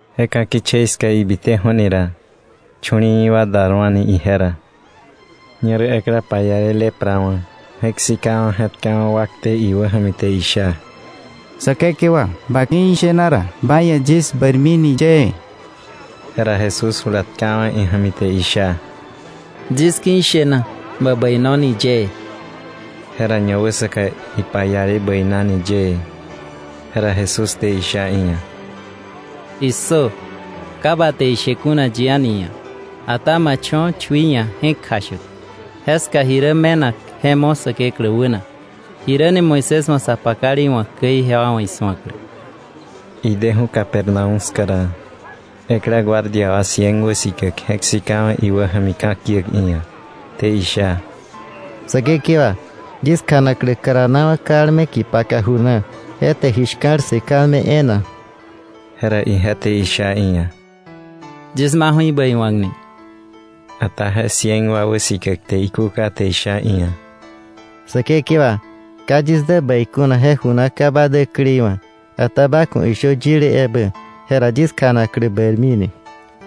Je ka̱ kichei ska ibiteju̱ni ra, chu̱li̱i̱wa̱ dar wa̱ni ije ra. Ñerä ekla paiale lepra wa̱ je̱k sikawa̱ je̱tkawa̱ wakte iwä ja̱mi, te isha: —Säkekewa, ba ki̱ ishena ra, ba ia̱ yis bäirmi ni yëë. Jera Jesús jula tkawa̱ ija̱mi te isha: —Yis ki̱ ishena; bä bäino ni yëë. Jera ñawäsaka ipaiale bäinani yëë. Jera Jesús te isha iia̱: —¡Issö! Ka bä te je she kuna yi a̱ni ia̱, ata ma cho̱ chui ia̱ je̱k kjashäk. Jeska ji rä me̱nak je mo̱ Säkeklä wäna, jiräni Moisés wa̱ sa pakale iwa̱k käi, ijewa wa̱ isu̱aklä. Ideju̱ Capernaúm ska ra, ekla guardia wa cien wäsikäk je̱k sikawa̱ iwäja̱mi ka̱kiäk iia̱, te isha: —Säkekewa, yis kjanaklä karanawa̱ kalme kipaka ju na, je te ji shka̱l ssë kalme e̱e̱na. Jera ije te isha iia̱: —Yis maju̱ ibäi wa̱k ni. Ata je cien wa wäsikäk te ikúka, te isha iia̱: —Säkekewa, ka yis dä bäi kuna je ju na ka ba däkleiwa̱. Ata ba ku̱ ishö yile ebä, jera yis kjanaklä bäirmini.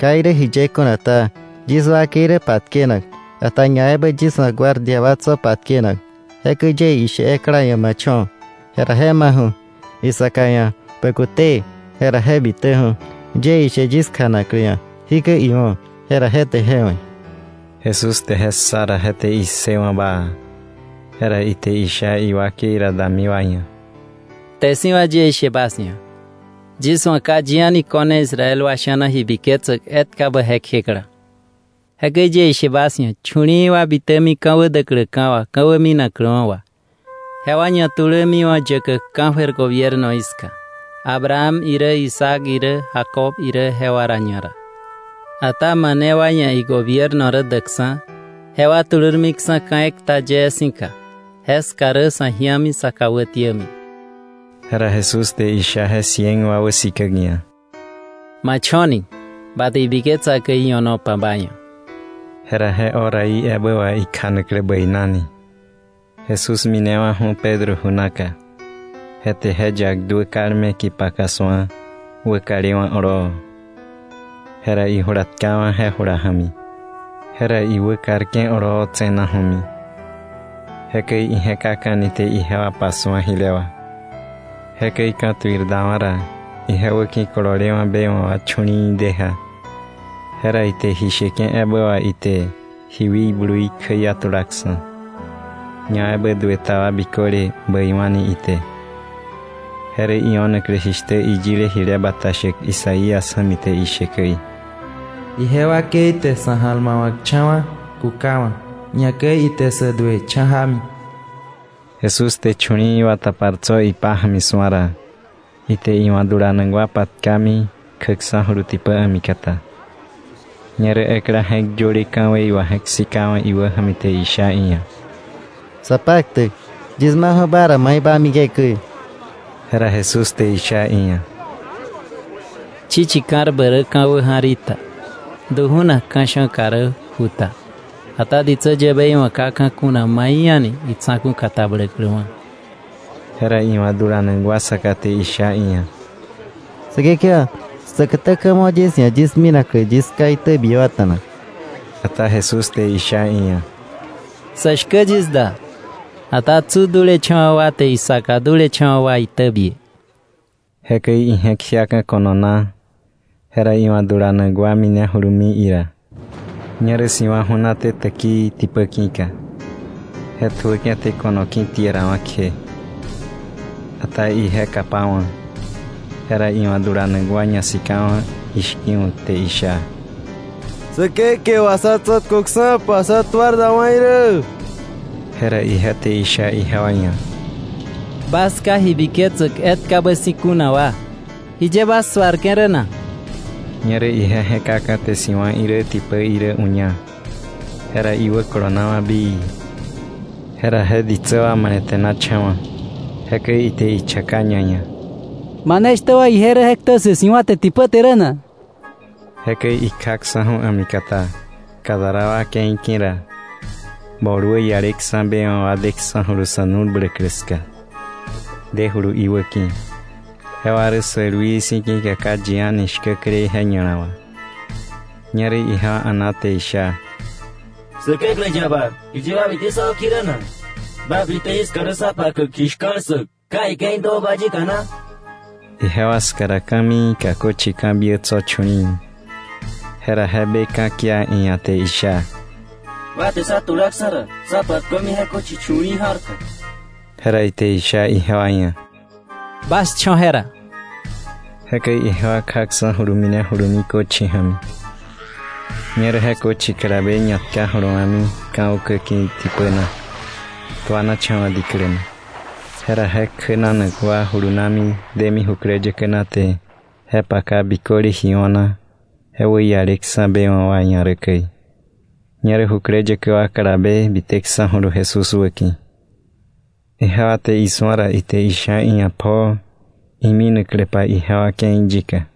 Ka irä jiye kuna ta, yis wakei rä patkenak, ata ñaebä yis wa̱ guardia wa tso̱ patkenak. Jekäi yie ishe ekla ia̱: “Ma cho̱”, jera je maju̱; isaka ia̱: “Bä kute”, jera je bitäju̱; yie ishe yis kjanaklä ia̱: “Jikäi iwo̱”, jera je te je we̱. Jesús te je ssa ra, je te issëwa̱ baa. Jera ite isha iwakei ra dami wa ia̱: —Kte si̱ wà yie ishe bas ia̱, yis wa̱ ka yi a̱ni ko̱ne Israel wa sha̱na ji biketsäk etkabä je kjekla. Jekäi yie ishe bas ia̱, chu̱li̱i̱ bitämi ka̱wä däkläka̱ wà, ka̱wä minakläwa̱ wa, jewa ñatulämiwa̱ yäkäk ka̱jöir gobiernoí ska, Abraham irä, Isaac irä, Jacob irä, jewa ra ñara. Ata mane wa ia̱ igobierno rä däkksa̱, jewa tulurmiksa̱ ka̱ ekta yee si̱ka; jeska rä sa̱ ji̱ami, sa kà wätiämi. Jera Jesús te isha je cien wa wäsikäk ia̱: —Ma cho̱ni; ba te ibiketsa käi io̱nopa ba ia̱. Jera je horaí ebä wà ikjanaklä bäinani. Jesús minewa̱ju̱ Pedro ju naka, je te je yak duä kalme kipaka su̱a, wäkalewa̱ oloowa̱. Jera ijula tkawa̱ je jula ja̱mi, jera iwäkarke̱ oloo tse̱naju̱mi. Jekäi ije̱kaka̱ni te ijewa pasu̱a jile wà. Jekäi ka̱tuir dawa̱ ra, ije wäki̱ kololewa̱ be wa̱ wa chu̱li̱i̱ de ja. Jera ite ji sheke̱ ebä wà ite ji wikbluí kjäiatulaksa̱, ñaebä duë ta wa biköle bäiwa̱ni ite. Je rä io̱naklä jishtä iyile jile bata shäk Isaías ja̱mi te ishe käi: “Ije wakei te sa̱ ja̱lmawa̱kcha̱wa̱ kukawa̱, ñakäi ite sä duë cha̱ jámi.” Jesús te chu̱li̱i̱ wa tapar tso̱ ipája̱mi su̱a ra, ite iwa̱ dulanak wa patkami kjäksa̱julu tipä a̱mikata. Ñerä ekla je̱k yöle ka̱wei wà je̱k sikawa̱ iwäja̱mi te isha iia̱: —Sapaktäk, yis maju̱ ba ra mai ma mike̱ käi. Jera Jesús te isha iia̱: —Chichi ka̱rbä rä ka̱ wäja̱r í ta, du ju̱nak ka̱sha̱ka rä ju ta, ata ditsä yäbei wa̱ ka ka̱ kuna mai a̱ni itsa̱ku̱ katabläkläwa̱. Jera iwa̱ dulanak wa saka te isha iia̱: —Säkekewa, säkätä ka̱ mo yis ia̱ yis minaklä yis ká itäbiäkwa̱ta̱na. Ata Jesús te isha iia̱: —Sä shkä yis da, ata tsu dulecha̱wa̱ wa te isaka dulecha̱wa̱ wa itäbie. Jekäi ije̱k jiaka̱ ko̱no na, jera iwa̱ dulanak wa minejulumi ira. Ñerä si̱wa̱ ju̱naté täkii tipä ki̱ka, je tjuäke̱ te ko̱no ki̱tierawa̱ kje, ata ije kapawa̱. Jera iwa̱ dulanak wa ñasikawa̱ ishki̱wa̱k te isha: —¡Säkekewa, sá tsa̱tköksa̱pa, sa tuar dawa̱ irä! Jera ije te isha ijewa ia̱: —¿Bas ka ji biketsäk etkabä si̱ kuna wa, jiye bas suarke̱ rä na? Ñerä ije je̱kaka̱ te si̱wa̱ irä, tipä irä uña, jera iwäkolonawa̱ bii. Jera je ditsä wa male̱te̱nacha̱wa̱, jekäi ite ichaka ñaia̱: —¿Mane shtä wa ije rä, je ktä ssë si̱wa̱ te tipä te rä na? Jekäi ikjaksa̱ju̱ a̱mikata Gadara wa ke̱i ki̱ ra, bol wäialeksa̱ be wa̱ daksa̱julu sa̱ nu̱l bläklä ska, dejulu iwäki̱. Jewa rä sälwii si̱ ki̱ka ka yi a̱ni shkäklei je ña̱la wà. Ñerä jewa a̱na te isha: —¿Säkeklä yaba, jiye ba bite sá wäki̱ rä na? ¿Ba bite jiska rä sá pakäk ji shka̱l ssäk ka ike̱i däwa̱ba yika na? Ijewa ska ra, ka̱miika köchi ka̱biä tso̱ chu̱li̱i̱. Jera je be ka̱kia iia̱, te isha: —Ba te sá tulaksa̱ ra, sá patkömi je köchi chu̱li̱i̱ ja̱rka. Jera ite isha ijewa ia̱: —Bas cho̱ jera. Jekäi ijewa kjaksa̱julu minejulumi köchi ja̱mi, ñerä je köchi kalabe ñatka jolowa̱mi ka̱ ukä ki̱ tipä na, tuanacha̱wa̱ diklä na. Jera je kjänanak wa julunami demi jukläyäkä na, te je paka biköle ji o̱na je wäialeksa̱ be wa̱ wa ia̱ rä käi. Ñerä jukläyäkä wa kalabe biteksa̱julu Jesús wäki̱. Ijewa te isu̱a ra, ite isha iia̱ pjoo iminakläpa ijewa ke̱i yika.